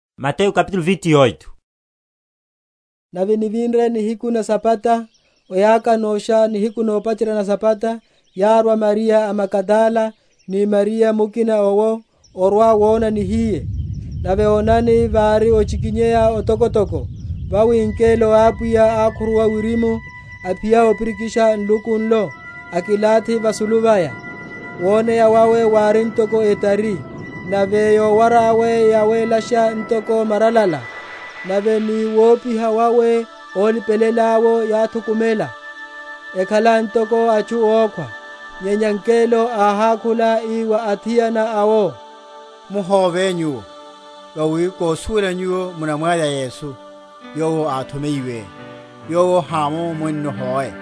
Ovinya’tho wa Yesu. Nave nivinre nihiku na Sabata, oyaka núsha, nihiku nopacherya na Sabata, yárwa Mariya a Magadala, ni Mariya mukina owo, orwa‐wona nihiye. Nave onani, vári ochikinyeya otokotoko; vawi ngelo a Apwiya ákhuruwa wirimu, aphiya opirikisha nluku nlo, akilathi vasulu vaya. Woneya wawe wári ntoko etari, nave yowara yawe yawélasha ntoko maralala; nave ni wopiha wawe ólipelela’wo yáthukumela, ekhala ntoko atchu ókhwa. Nyenya ngelo áhákhula, ii wa athiana awo, Muhóve nyuwo: vawi kosuwela nyuwo munavya Yesu, yowo áthomeyiwe. Yowo hámo munno hoe;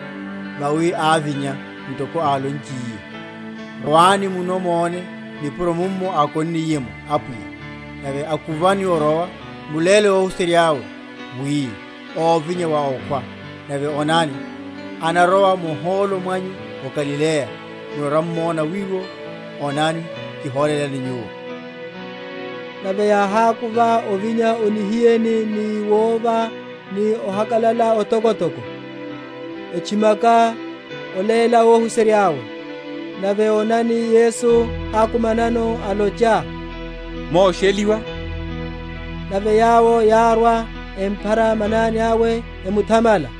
vawi ávinya, ntoko álonchiye. Rwani munno mone nipuro mummo ákonniye’mo Apwiya. Nave akuvani orowa, muléle óhuserya’we, wi, óvinya wa okhwa; nave onani, anarowa muhólo mwanyu o Galileya; munarwa‐m’mona wiwo: onani, kiholelani nyuwo. Nave yáhákuva ovinya o nihiyeni, ni wova ni ohakalala otokotoko, etchimaka oléla óhuserya’we. Nave onani, Yesu ákumanano, alocha, Mosheliwa. Nave yawo yárwa, emphara manani awe, emuthamala.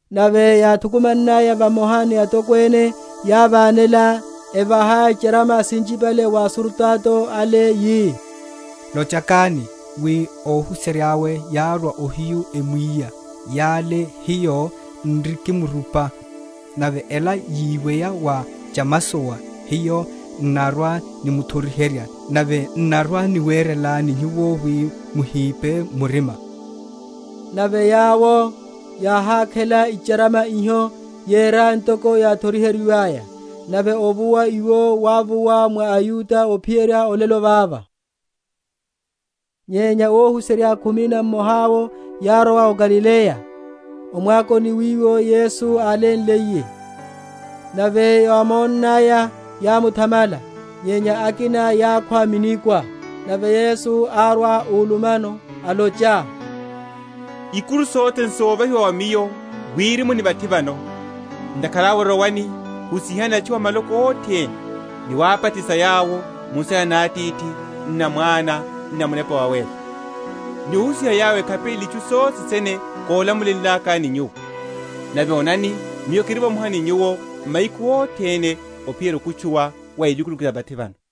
Nave yáthukumannaya vamoha ni atokwene, yávanela, evaha icharama sinchipale wa asurutato ale, yi, Lochakani, wi, óhuserya’we yárwa ohiyu, emwiya Yole hiyo n’rikimrupa. Nave ela yiweya wa chamasowa, hiyo n’narwa‐nimuthoriherya, nave n’narwa‐niwerelani nyuwo wi muhipe murima. Nave yawo yáhákhela icharama iho, yera ntoko yáthoriheryiwaya: nave ovuwa iwo wávuwa mwa aYuda, ophiyerya olelo vava. Woneya wa Yesu. Nyenya óhuserya khumi na mmoha’wo yárowa o Galileya, o mwakoni wiwo Yesu álamulenliye. Nave yámonnaya, yámuthamala: nyenya akina yákhwa minikwa. Nave Yesu árwa úlumano, alocha, Ikuru sothe sene sovahiwa wa Miyo Wirimu ni vathi vano. Ntakhara awe rowani, husihani atchu a maloko othene, ni wabatisa yawo mu nsina na Atithi, n’na Mwana, n’na Munepa Wawéla: ni ohusiha yawo ekhapelele itchu sothe sene kólamulenlakani nyuwo: nave onani, Miyo kiri vamoha ni nyuwo mahiku othene, ophiyerya okutchuwa wa elukuluku ya vathi vano.